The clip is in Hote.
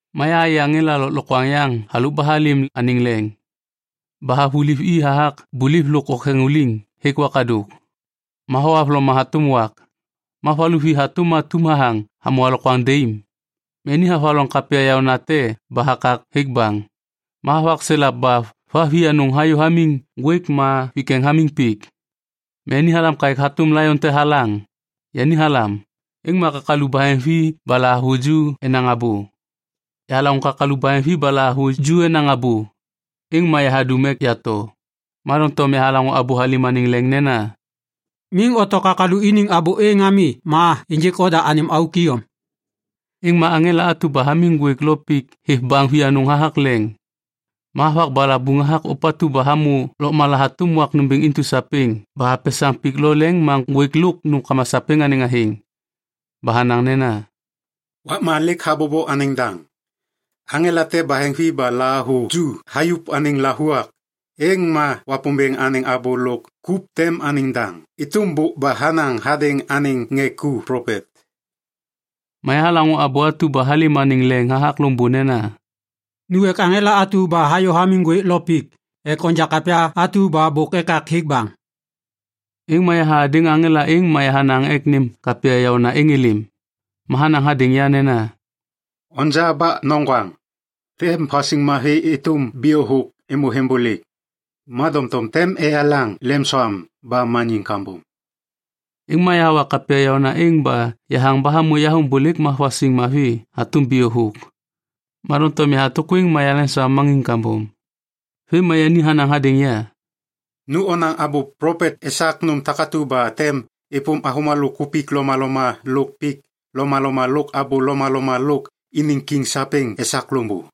Ma yahayê aŋela lôklokwaŋ yaŋ halôk ba halêm anêŋ leŋ. Ba havuliv i hathak buliv lôk oktheŋuliŋ hêk wakadôk. Ma thohavloma hatôm wak. Ma va luvi hatôm atum hathaŋ hamô alokwaŋ daim. Ma yani havaloŋ kapya yaônate ba hakak hêk baŋ. Ma havakselap ba va vianôŋ hayô hamiŋ ŋgwêk ma vikeŋ hamiŋ pik. Ma yani halam kaêk hatôm laion te halaŋ. Yani halam, êŋ ma kakalu baheŋvi ba lahavuju enaŋ abô. Yahalaŋô kakalu baheŋvi ba lahavuju enaŋ abô, êŋ ma yahadum ek yato. Ma doŋtom yahalaŋô abô halêm anêŋ leŋ nena, “Miŋ oto kakalu iniŋ abô êŋ ami ma ênjêk oda anêm auk iyom.” Êŋ ma aŋela atu ba hamiŋ ŋgwêk lo pik hêv baŋ vianôŋ hathak leŋ. Ma havak balabuŋ hathak ôpatu ba hamô lôkmala hatôm wak nômbêŋ intu sapêŋ ba hapesaŋ pik lo leŋ ma ŋgwêk lôk nômkama sapêŋ anêŋ athêŋ. Ba hanaŋ nena, “Wakma lêk habobo anêŋ daŋ. Aŋela te baheŋvi ba lahavuju hayuv anêŋ lavuak, êŋ ma Wapômbêŋ anêŋ abô lôk kup tem anêŋ daŋ êtôm bôk ba hanaŋ hadêŋ anêŋ ŋê ku plopet.” Ma yahalaŋô abô atu ba halêm anêŋ leŋ hathak loŋbô nena, “Nu ek aŋela atu ba hayô hamiŋ ŋgwêk lo pik ek onja kapya atu ba bôk ekak hêk baŋ.” Êŋ ma yaha hadêŋ aŋela êŋ ma yahanaŋ ek nêm kapya yaôna êŋ êlêm. Ma hanaŋ hadêŋ ya nena, “Onja ba noŋgwaŋ. Tem vasiŋ mavi êtôm bio thôk êmô vembôlêk, ma doŋtom tem eyelaŋ lemsoam ba maniŋ kambom.” Êŋ ma yahawa kapya yaôna êŋ ba yahaŋ ba hamô yaveŋbôlêk ma vasiŋ mavi hatôm bio thôk. Ma doŋtom yahatôkwêŋ ma yaleŋsoam maniŋ kambom. Vêm ma yani hanaŋ hadêŋ ya, “Nu onaŋ abô plopet esak nôm takatu ba tem êpôm avômalô kupik lomaloma lôk pik lomaloma lôk abô lomaloma lôk iniŋ kiŋ sapêŋ esak loŋbô.”